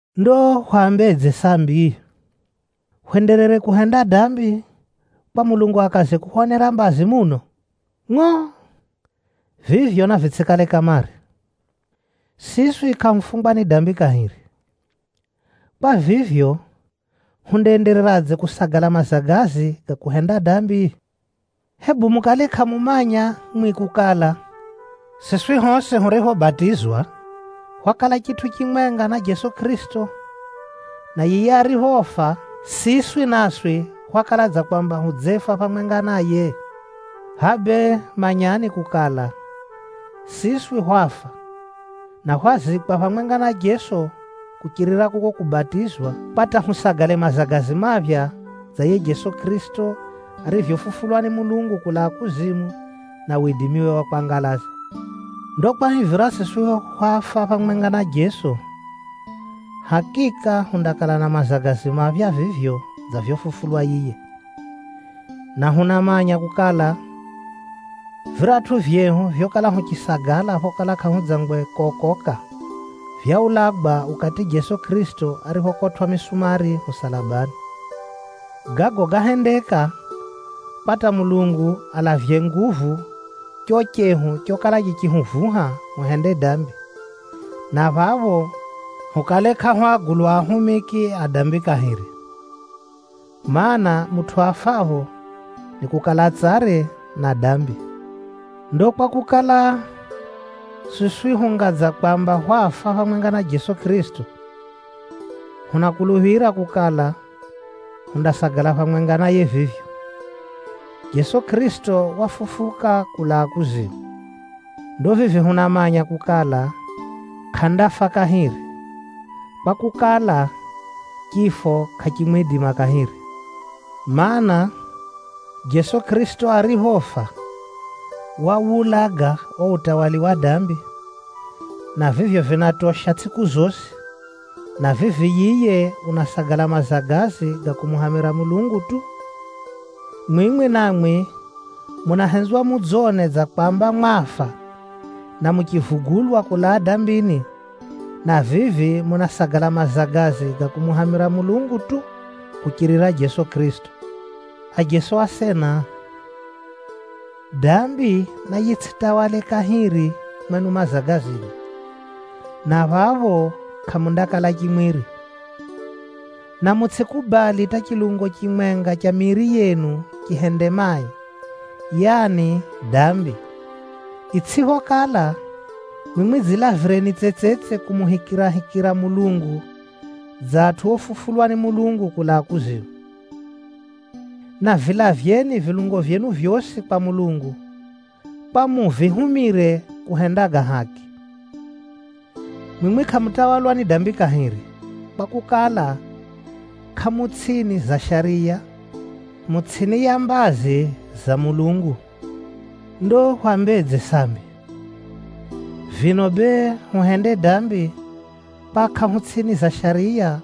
Ndo hwambedze sambi? Hwenderere kuhenda dambi kwa Mulungu akaze kuhwonera mbazi muno? Ngʼo! Vivyo navitsʼikale kamare! Siswi kʼahufungwa ni dambi kahiri. Kwa vivyo, hundaendereradze kusagala mazagazi ga kuhenda dambi? Hebu mukale kʼamumanya mwimwi kukala, siswi hosi huriphobatizwa, hwakala chitʼu chimwenga na Jeso Kʼirisito, na yiye ariphofa, siswi naswi hwakala dza kwamba hudzefa phamwenga naye? Hʼa bee manyani kukala, siswi hwafa, na hwazikwa phamwenga na Jeso kuchirira kuko kubatizwa, kwa hata husagale mazagazi maphya dza yiye Jeso Kʼirisito arivyofufulwa ni Mulungu kulaa kuzimu na widimiwe wa kwangalaza. Ndo kwahivira siswi hwafa phamwenga na Jeso, hakika hundakala na mazagazi maphya vivyo dza vyofufulwa yiye. Na hunamanya kukala, viratʼu vyehu vyokala huchisagala phokala kʼahudzangwe kokoka, vyaulagwa ukati Jeso Kʼirisito ariphokotwʼa misumari musalabani. Gago gáhendeka, kwa hata Mulungu alavye nguvu cho chehu chokala chichihuvuha huhende dambi, na phapho hukale kʼahu agulwa ahumiki a dambi kahiri. Maana, mutʼu afapho, nikukala tsare na dambi. Ndo kwakukala, siswi hunga dza kwamba hwafa phamwenga na Jeso Kʼirisito, hunakuluphira kukala, hundasagala phamwenga naye vivyo. Jeso Kʼirisito wafufuka kulaa kuzimu. Ndo vivi hunamanya kukala, kʼandafa kahiri, kwakukala, chifo kʼachimwidima kahiri. Maana, Jeso Kʼirisito ariphofa, wawulaga o utawala wa dambi, na vivyo vinatosha tsʼiku zosi, na vivi yiye unasagala mazagazi ga kumuhamira Mulungu tu. Mwimwi namwi munahenzwa mudzone dza kwamba mwafa na muchivugulwa kulaa dambini, na vivi munasagala mazagazi ga kumuhamira Mulungu tu, kuchirira Jeso Kʼirisito. Ajeso asena, dambi nayitsʼitawale kahiri mwenu mazagazini, na phapho kʼamundakala chimwiri. Na mutsʼikubali hata chilungo chimwenga cha miiri yenu chihende mai, yaani dambi. Itsʼiphokala, mwimwi dzilavireni tsetsetse kumuhikirahikira Mulungu dza atʼu ofufulwa ni Mulungu kulaa kuzimu. Na vilavyeni vilungo vyenu vyosi kwa Mulungu, kwa muvihumire kuhenda ga haki. Mwimwi kʼamutawalwa ni dambi kahiri, kwakukala, kʼamu tsʼini za shariya, mu tsʼini ya mbazi za Mulungu. Ndo hwambedze sambi? Vino bee, huhende dambi kwa kʼahu tsʼini za shariya,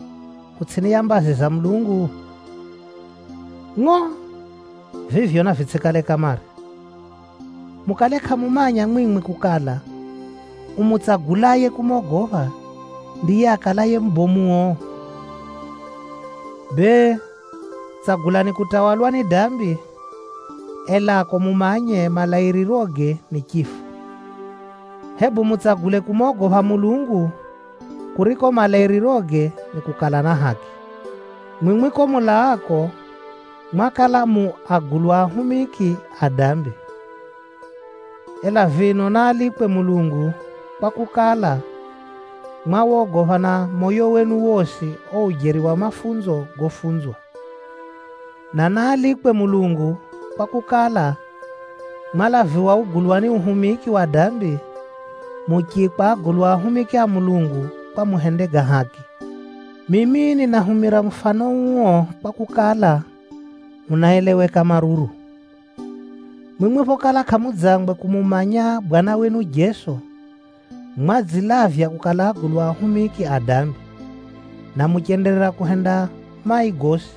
hu tsʼini ya mbazi za Mulungu? Ngʼo! Vivyo navitsʼikale kamare! Mukale kʼamumanya mwimwi kukala, umutsagulaye kumogopha, ndiye akalaye mubomuo? Bee, tsagulani kutawalwa ni dambi, elako mumanye, malairiroge ni chifo. Hebu mutsagule kumogopha Mulungu, kuriko malairiroge ni kukala na haki. Mwimwi ko mulaako mwakala mu agulwa ahumiki a dambi. Ela vino naalikwe Mulungu, kwakukala, mwawogopha na moyo wenu wosi o ujeri wa mafunzo gofunzwa. Na naalikwe Mulungu, kwakukala, mwalaviwa ugulwani uhumiki wa dambi, muchiikwa agulwa ahumiki a Mulungu kwa muhende ga haki. Mimi ninahumira mufano uo kwakukala, unaeleweka maruru. Mwimwi phokala kʼamudzangwe kumumanya Bwana wenu Jeso, mwadzilavya kukala agulwa ahumiki a dambi, na muchenderera kuhenda mai gosi.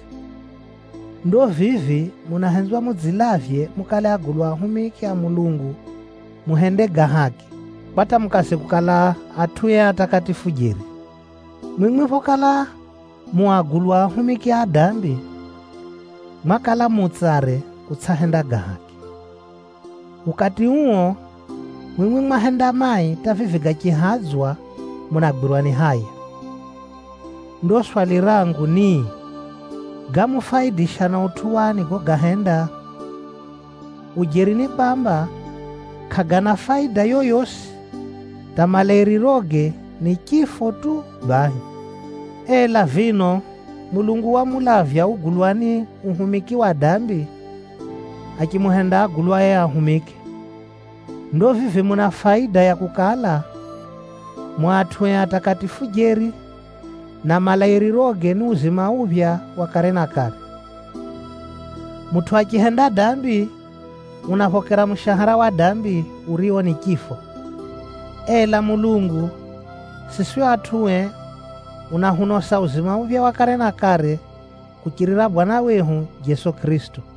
Ndo vivi munahenzwa mudzilavye mukale agulwa ahumiki a Mulungu muhende ga haki, kwa hata mukaze kukala atʼue atakatifu jeri. Mwimwi phokala mu agulwa ahumiki a dambi, mwakala mu tsare kutsʼahenda ga haki. Ukati uo, mwimwi mwahenda mai hata vivi gachihadzwa munagwirwa ni haya. Ndo swali rangu ni, gámufaidisha na utʼu wani gogahenda? Ujeri ni kwamba, kʼagana faida yoyosi, hata malairiroge ni chifo tu bahi. Ela vino Mulungu wamulavya ugulwani uhumiki wa dambi, achimuhenda agulwae ahumiki. Ndo vivi muna faida ya kukala, mu atʼue atakatifu jeri, na malairiroge ni uzima uphya wa kare na kare. Mutʼu achihenda dambi, unaphokera mushahara wa dambi, urio ni chifo. Ela Mulungu, siswi atʼue unahunosa uzima uphya wa kare na kare kuchirira Bwana wehu Jeso Kʼirisito.